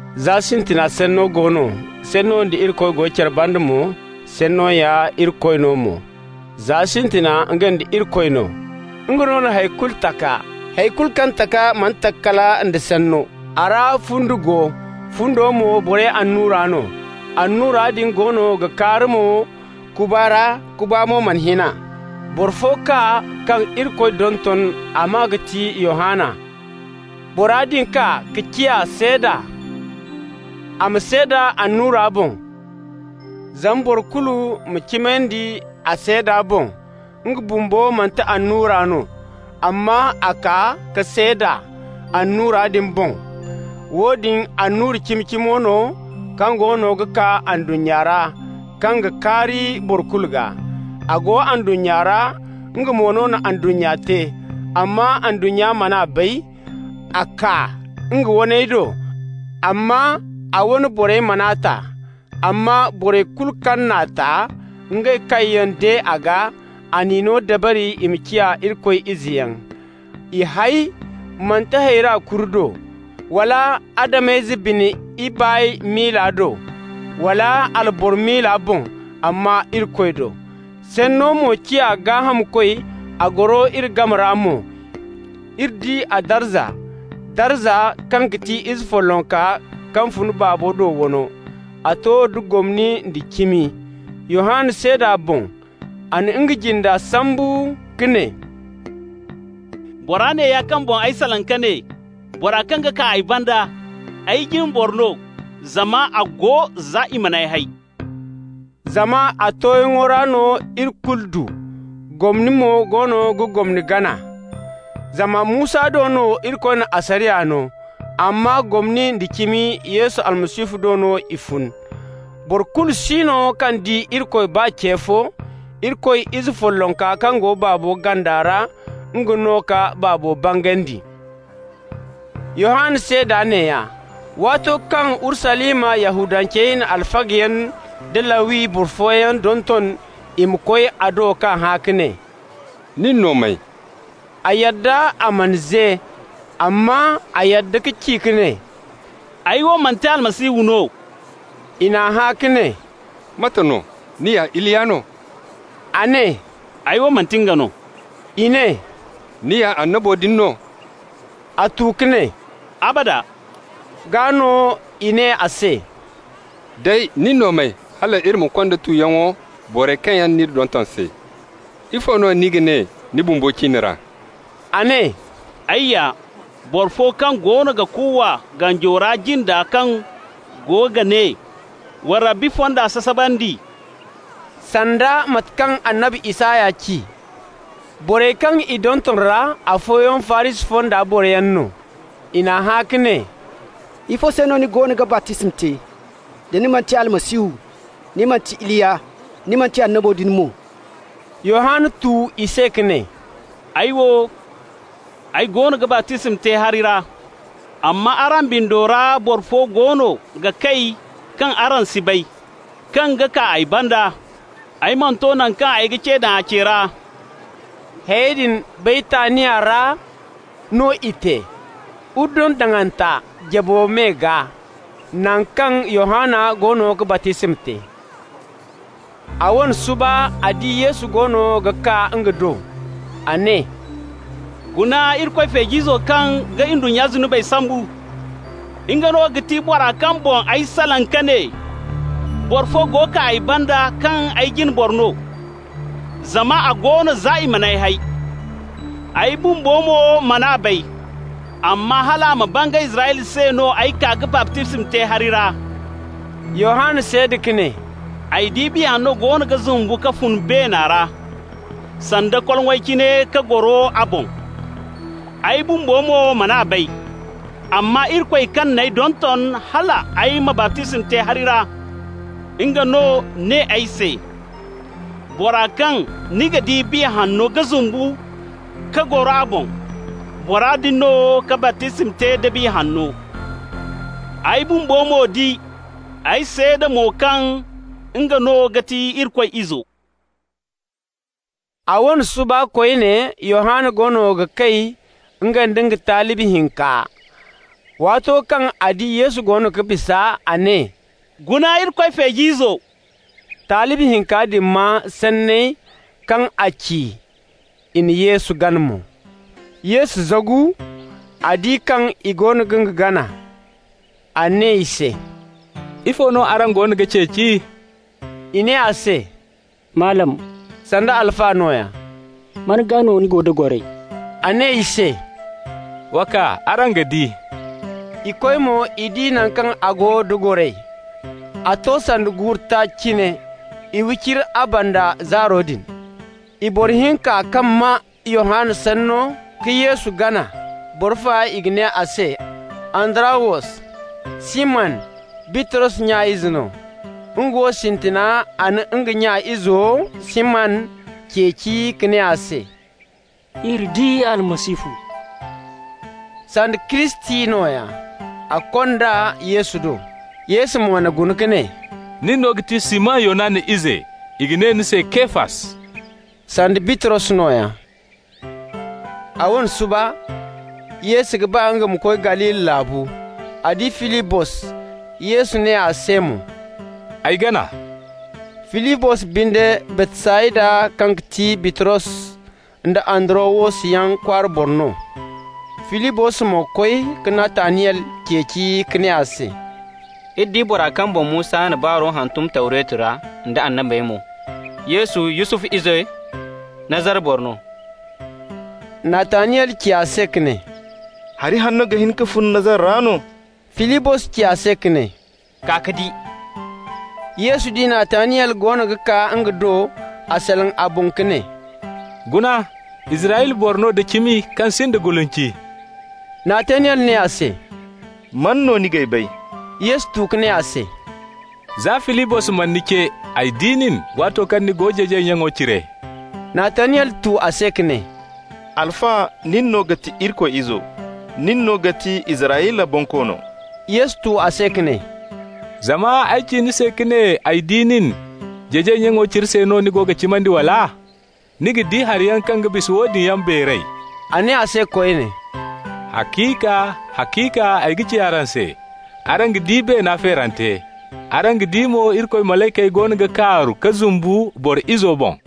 Za sintina Sanno go no. Sanno da Irikoy go care banda mo, Sanno ya Irikoy no mo. Za sintina nga nda Irikoy no. Nga no na hay kulu taka. Hay kulu kaŋ taka mana taka kala nda Sanno. A ra fundi go, fundo mo borey annura no. Annura din goono ga kaari mo kuba ra, kuba mo mana hin a. Boro fo kaa kaŋ Irikoy donton, a maa ga ti Yohanna. Bora din kaa ka ciya seeda, a ma seeda annura boŋ, zama boro kulu ma cimandi a seeda boŋ. Nga bumbo manti annura no, amma a kaa ka seeda annura din boŋ. Woodin annura cimi-cimo no kaŋ goono ga kaa ndunnya ra, kaŋ ga kaari boro kulu gaa. A go ndunnya ra, nga mo no na ndunnya te, amma ndunnya man'a bay. A kaa nga waney do, amma a wane borey man'a ta. Amma borey kulu kaŋ n'a ta, ngey kaŋ yaŋ de a gaa, a n'i no dabari i ma ciya Irikoy izeyaŋ. I hay manti hayrey kuri do, wala Adam-ize bine ibaay miila do, wala alboro miila boŋ, amma Irikoy do. Sanno mo ciya gaahamkoy, a goro iri game ra mo. Iri di a darza, darza kaŋ ti Ize follonka kaŋ fun Baaba do wano. A to da gomni nda cimi. Yohanna seeda a boŋ. A na nga jinde sambu ka ne: «Bora neeya kaŋ boŋ ay salaŋ ka ne: ‹Bora kaŋ ga kaa ay banda, ay jine boro no, zama a go no za i man'ay hay.›» Zama a tooyaŋo ra no iri kulu du. Gomni mo goono ga gomni gana. Zama Musa do no Irikoy na asariya no, amma gomni nda cimi, Yesu Almasihu do no i fun. Boro kulu si no kaŋ di Irikoy baa ce fo. Irikoy Ize follonka kaŋ go Baaba ganda ra, nga no ka Baaba bangandi. Yohanna seeda neeya, waato kaŋ Urusalima Yahudancey na alfagayaŋ da Lawi boro fooyaŋ donton i ma koy a do k'a hã ka ne: «Nin no may?» A yadda, a mana ze, amma a yadda ka ci ka ne: «Ay wo manti Almasihu no.» I n'a hã ka ne: «Mate no, ni ya Iliya no?» A ne: «Ay wo manti nga no.» I ne: «Ni ya annabo din no?» A tu ka ne: «Abada.» Gaa no i ne a se: «Day, nin no may, hal iri ma konda tuyaŋo borey kaŋ n'iri donton se? Ifo no ni ga ne ni bumbo ciine ra?» A ne: «Ay ya boro fo kaŋ goono ga kuuwa ganjo ra jinda kaŋ go ga ne: ‹Wa Rabbi fonda sasabandi.›» sanda mate kaŋ annabi Isaya ci. Borey kaŋ i donton ra, afooyaŋ Farisi fonda boroyaŋ no. I n'a hã ka ne: «Ifo se no ni goono ga baptisma te, da ni manti Almasihu, ni manti Iliya, ni manti annabo din mo?» Yohanna tu i se ka ne: «Ay wo, ay goono ga baptisma te hari ra, amma araŋ bindo ra boro fo goono ga kay kaŋ araŋ si bay, kaŋ ga kaa ay banda. Ay mana to naŋ kaŋ ay ga ce daŋ a ce ra.» Hayey din Baytaniya ra no i te, Urdun daŋanta jabo me gaa, naŋ kaŋ Yohanna goono ga baptisma te. A wane suba, a di Yesu goono ga kaa nga do. A ne: «Guna Irikoy feej'izo kaŋ ga ndunnya zunubey sambu! Nga no ga ti bora kaŋ boŋ ay salaŋ ka ne: ‹Boro fo go kaa ay banda kaŋ ay jine boro no, zama a go no za i man'ay hay.› Ay bumbo mo man'a bay, amma hal a ma bangay Israyla se no ay kaa ka baptisma te hari ra.» Yohanna seeda ka ne: «Ay di Biya Hanno goono ga zumbu ka fun beena ra sanda koloŋay cine ka goro a boŋ. Ay bumbo mo man'a bay, amma Irikoy kaŋ n'ay donton hal ay ma baptisma te hari ra, nga no ne ay se: ‹Bora kaŋ ni ga di Biya Hanno ga zumbu ka goro a boŋ, bora din no ga baptisma te da Biya Hanno.› Ay bumbo mo di, ay seeda mo kaŋ nga no ga ti Irikoy Izo.» A wane suba koyne, Yohanna goono ga kay, nga nda nga talibi hinka. Waato kaŋ a di Yesu goono ga bisa, a ne: «Guna Irikoy feej'izo!» Talibi hinka din maa sanney kaŋ a ci, i na Yesu gana mo. Yesu zagu, a di kaŋ i goono ga nga gana. A ne i se: «Ifo no araŋ goono ga ceeci?» I ne a se: «Malam (sanda Alfa nooya), man gaa no ni go da goray?» A ne i se: «Wa kaa, araŋ ga di.» I koy mo, i di naŋ kaŋ a go da goray (a to sanda guuru taaci cine). I wicira a banda zaaro din. I boro hinka kaŋ maa Yohanna sanno ka Yesu gana, boro fa i ga ne a se Andarawos, Siman Bitros nya ize no. Nga wo, sintina a na nga nya izo Siman ceeci ka ne a se: «Iri di Almasihu» (sanda Kiristi nooya). A kond'a Yesu do. Yesu mo n'a guna ka ne: «Ni no ga ti Siman Yonana ize. I ga ne ni se Kefas» (sanda Bitros nooya). A wane suba, Yesu ga ba nga ma koy Galili laabu. A di Filibos. Yesu ne a se mo: «Ay gana.» Filibos binde Baytsayda, kaŋ ti Bitros nda Andarawos yaŋ kwaara, boro no. Filibos mo koy ka Nataniyel ceeci ka ne a se: «Iri di bora kaŋ boŋ Musa na baaro hantum Tawretu ra, nda annabey mo -- Yesu Yusufu ize, Nazara boro no.» Nataniyel ci a se ka ne: «Hari hanno ga hin ka fun Nazara ra no?» Filibos ci a se ka ne: «Kaa ka di!» Yesu di Nataniyel goono ga kaa nga do. A salaŋ a boŋ ka ne: «Guna, Israyla boro no da cimi kaŋ sinda gulinci.» Nataniyel ne a se: «Man no ni g'ay bay?» Yesu tu ka ne a se: «Za Filibos mana ni ce, ay di nin, waato kaŋ ni go jeejay nyaŋo cire.» Nataniyel tu a se ka ne: «Alfa, nin no ga ti Irikoy Izo! Nin no ga ti Israyla Bonkoono!» Yesu tu a se ka ne: «Zama ay ci ni se ka ne ay di nin jeejay nyaŋo cire se no ni go ga cimandi, wala? Ni ga di hariyaŋ kaŋ ga bisa woodin yaŋ beeray.» A ne a se koyne: «Haciika, haciika ay ga ci araŋ se: araŋ ga di beena feerante. Araŋ ga di mo Irikoy malaykey goono ga kaaru ka zumbu Boro Izo boŋ.»